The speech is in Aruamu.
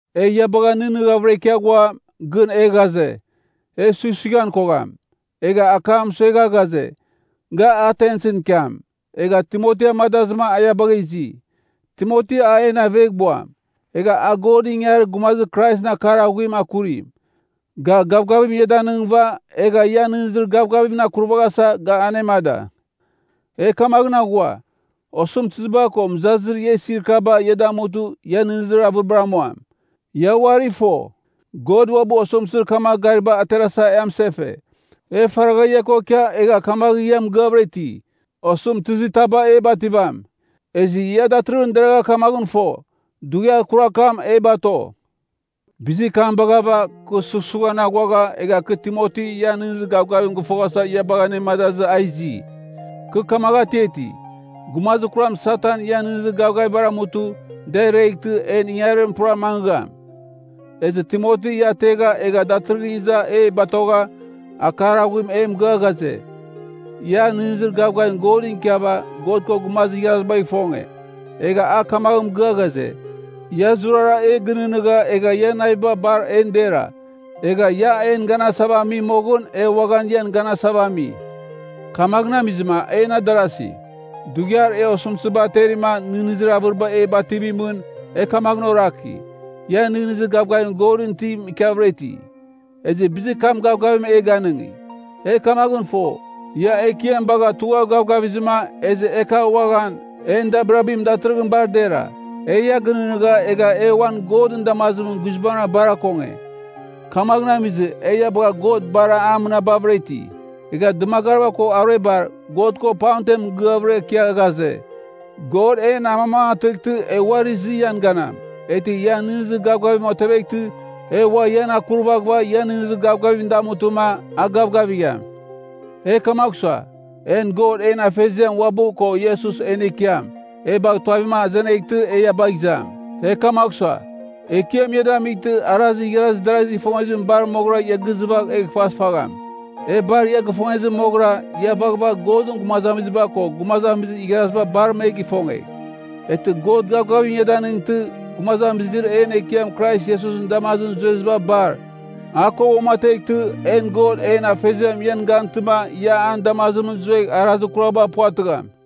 E ia bagha nɨghnɨghavɨra ikia ghua, gɨn e ghaze, e sughsughan kogham. Egha akam mɨsuegha ghaze, ga Atensɨn ikiam. Egha Timoti amadazɨma a ia bagha izi. Timoti a en aveghbuam. Egha a Godɨn ingangarir gumazir Kraisɨn akar aghuim akurim. Ga gavgavim ia danɨngɨva, egha ian nɨghnɨzir gavgavimɨn akurvaghasa ga anemada. E kamaghɨn aghua, osɨmtɨziba ko mɨzazir ia isir kaba ia damutɨ ia nɨghnɨzir avɨribar amuam. Ia uari fo, God uabɨ osɨmtɨzir kamagh gariba aterasa e amɨsefe. E faragha ia ko ikia egha kamagh ia mɨgɨavɨra iti, osɨmtɨzitaba e bativam. Ezɨ ia datɨrɨghɨn deragha kamaghɨn fo, dughiar kurar kam e bato. Bizir kam baghava, kɨ sughsughan aghuagha, egha kɨ Timoti ian nɨghnɨzir gavgavim gɨfoghasa ia bagha anemadazɨ a izi. Kɨ kamagh atiati, gumazir kuram Satan ian nɨghnɨzir gavgavibar amutɨ, da ireghtɨ, en ingangarim pura mangɨgham. Ezɨ Timoti ia ategha egha datɨrɨghɨra iza e batogha, akar aghuim e mɨgɨa ghaze, ia nɨghnɨzir gavgavim Godɨn ikiava God ko gumazir igharazibagh ifonge. Egha a kamaghɨn mɨgɨa ghaze, ia zurara e gɨnɨghnɨgha egha ian naviba bar en dera. Egha ia en ganasava ami moghɨn e uaghan ian ganasava ami. Kamaghɨn amizɨma, en adarasi, dughiar e osɨmtɨziba aterima nɨghnɨzir avɨriba e bativimɨn, e kamaghɨn oraki, ia nɨghnɨzir gavgavir Godɨn itim ikiavɨra iti; ezɨ bizir kam gavgavim e ganɨngi. E kamaghɨn fo, ia Ekiam bagha tugha gavgavizɨma, ezɨ e kagh uaghan, en dabirabim datɨrɨghɨn bar dera. E ia gɨnɨghnɨgha egha e uan Godɨn damazimɨn guizbangɨra bar akonge. Kamaghɨn amizɨ, e ia bagha God bar mɨnabavɨra iti. Egha dɨmagariba ko aruebar, God ko pamtem mɨgɨavɨra ikia ghaze, God en amamangatɨghtɨ e uari izɨ ian ganam. Eghtɨ ian nɨghnɨzir gavgavim oteveghtɨ, e ua ian akurvaghɨva ian nɨghnɨzir gavgavim damutɨma, a gavgavigham. E kamagh sua, en God en Afeziam uabɨ ko Iesus en Ekiam, e bagh tuavim azeneghtɨ e ia bagh izam. E kamagh sua, Ekiam ia damightɨ arazir igharazir darazigh ifongezim bar moghɨra ia gizɨfagh egh fasfagham. E bar ia gifongezɨ moghɨra, ia vaghvagh Godɨn gumazamiziba ko gumazamizir igharaziba bar me gifongegh. Eghtɨ God gavgavim ia danɨngtɨ, gumazamizir en Ekiam Iesusɨn damazimɨn zueziba bar, a ko uamateghtɨ, en God en Afeziam ian gantɨma ia an damazimɨn zuegh arazir kuraba puvatɨgham.